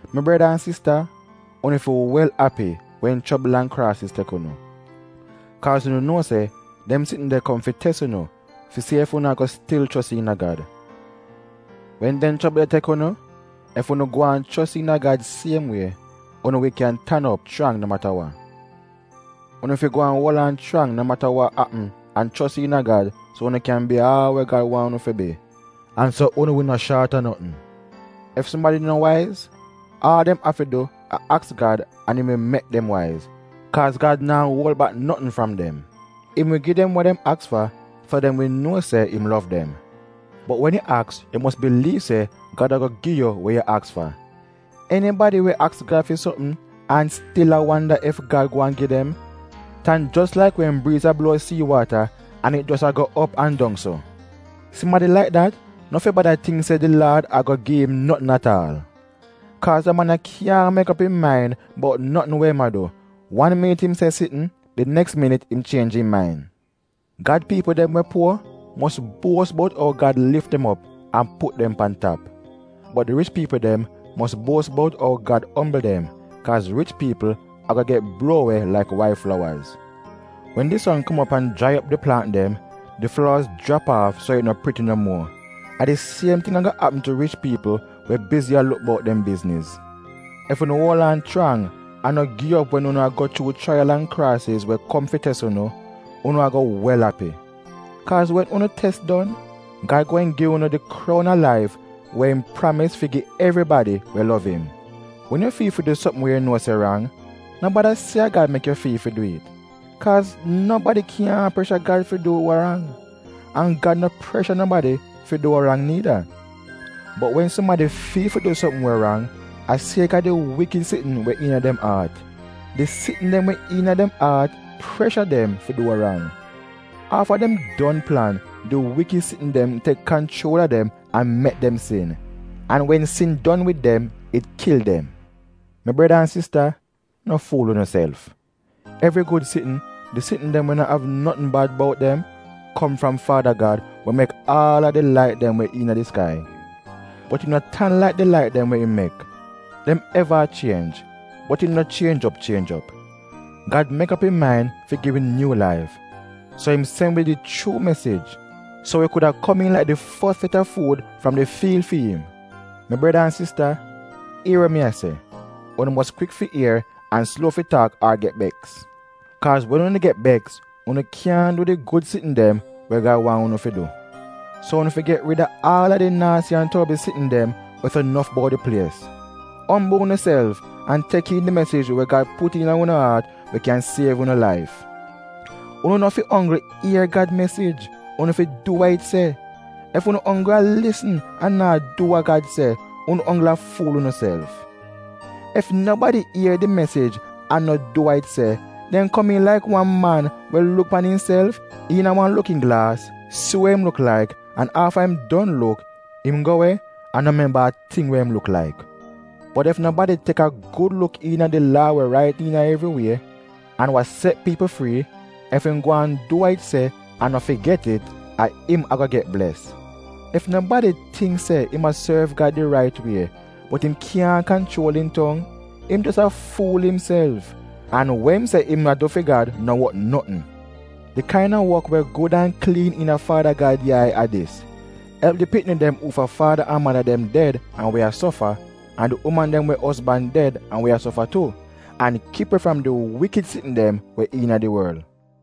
Mi breda an sista, unu fi wel api wen chobl an kraasiz tek unu. Kaaz unu nuo se dem sitn de kom fi tes unu fi si ef unu a-go stil chos iina Gad. Wen dem chobl de tek unu, ef unu gwaan chos iina Gad siem wie, unu wi kyan tan op chrang no mata wa. Unu fi gwaan uol aan chrang no mata wa apm an chos iina Gad so unu kyan bi aal we Gad waahn unu fi bi, an so unu wi no shaat a notn. Ef sumadi no waiz, aal dem afi du a aks Gad an im wi mek dem waiz, kaaz Gad naa go uol bak notn fram dem. Im wi gi dem wa dem aks fa so dem wi nuo se im lov dem. Bot wen yu aks yu mos biliiv se Gad a-go gi yu we yu aks fa. Enibadi we aks Gad fi sopm an stil a wanda ef Gad gweehn gi dem, tan jos laik wen briiz a bluo sii waata an it jos a-go op an dong so. Sumadi laik dat no fi bada tingk se di Laad a-go gi im notn at aal. Kaaz da man ya kyaahn mek op im main bout notn we im a du — wan minit im se sitn — di neks minit im chienj im main. Gad piipl dem we puor mos buos bout ou Gad lif dem op an put dem pan tap. Bot di rich piipl dem mos buos bout ou Gad ombl dem, kaaz rich piipl a-go get bluo we laik wail flowaz. Wen di son kom op an jrai op di plaant dem, di flowaz jrap aaf so it no priti no muo. A di siem ting a-go apm tu rich piipl we bizi a luk bout dem bizniz. Ef unu uol aan chrang an no gi op wen unu a go chuu chraiyal an kraasiz we kom fi tes unu, unu a-go wel api. Kaaz wen unu tes don, Gad gweehn gi unu di kroun a laif we im pramis fi gi evribadi we lov im. Wen yu fiil fi du sopm wa yu nuo se rang, no bada se a Gad mek yu fiil fi du it. Kaaz nobadi kyaahn presha Gad fi du wa rang, an Gad no presha nobadi fi du wa rang niida. Bot wen sumadi fiil fi du wa rang, a siek-a di wikid sitn we iina dem aat. Di sitn dem iina dem aat presha dem fi du wa rang. Afta dem don plan, di wikid sitn dem tek kanchuol a dem an mek dem sin. An wen sin don wid dem, it kil dem. Mi breda an sista, no fuul unuself. Evri gud sitn — di sitn dem we no av notn bad bout dem — kom fram Faada Gad we mek aal a di lait dem we iina di skai. Bot im no tan laik di lait dem we im mek. Dem eva a chienj, bot im no chienj op chienj op. Gad mek op im main fi gi wi nyuu laif, so im sen wi di chuu mesij, so wi kuda komiin laik di fos set a fuud fram di fiil fi im. Mi breda an sista, ier wa mi a se, unu mos kwik fi ier an sluo fi taak ar get beks. Kaaz wen unu get beks, unu kyaahn du di gud sitn dem we Gad waahn unu fi du. So unu fi get rid a aal a di naasi an torbl sitn dem we so nof bout di plies. Ombl unuself an tek iin di mesij we Gad put iina unu aat we kyan siev unu laif. Unu no fi onggl ier Gad mesij — unu fi du wa it se! Ef unu onggl a lisn an naa du wa Gad se, unu onggl a fuul unuself. Ef nobadi ier di mesij an no du wa it se, dem komiin laik wan man we luk pan imself iina wan lukin glaas, si wa im luk laik, an afta im don luk, im go we an no memba a ting we im luk laik. Bot ef nobadi tek a gud luk iina di Laa we rait iina evri wie, an wa set piipl frii, ef im gwaan du wa it se an no figet it — a im a-go get bles. Ef nobadi tingk se im a sorv Gad di rait wie, bot im kyaahn kanchuol im tong, im jos a fuul imself, an we im se im a du fi Gad no wot notn. Di kain-a wok we gud an kliin iina Faada Gad yai a dis: elp di pikni dem uufa faada an mada dem ded an we a sofa, an di uman dem we ozban ded an we a sofa tu, an kip we fram di wikid sitn dem we iina di worl.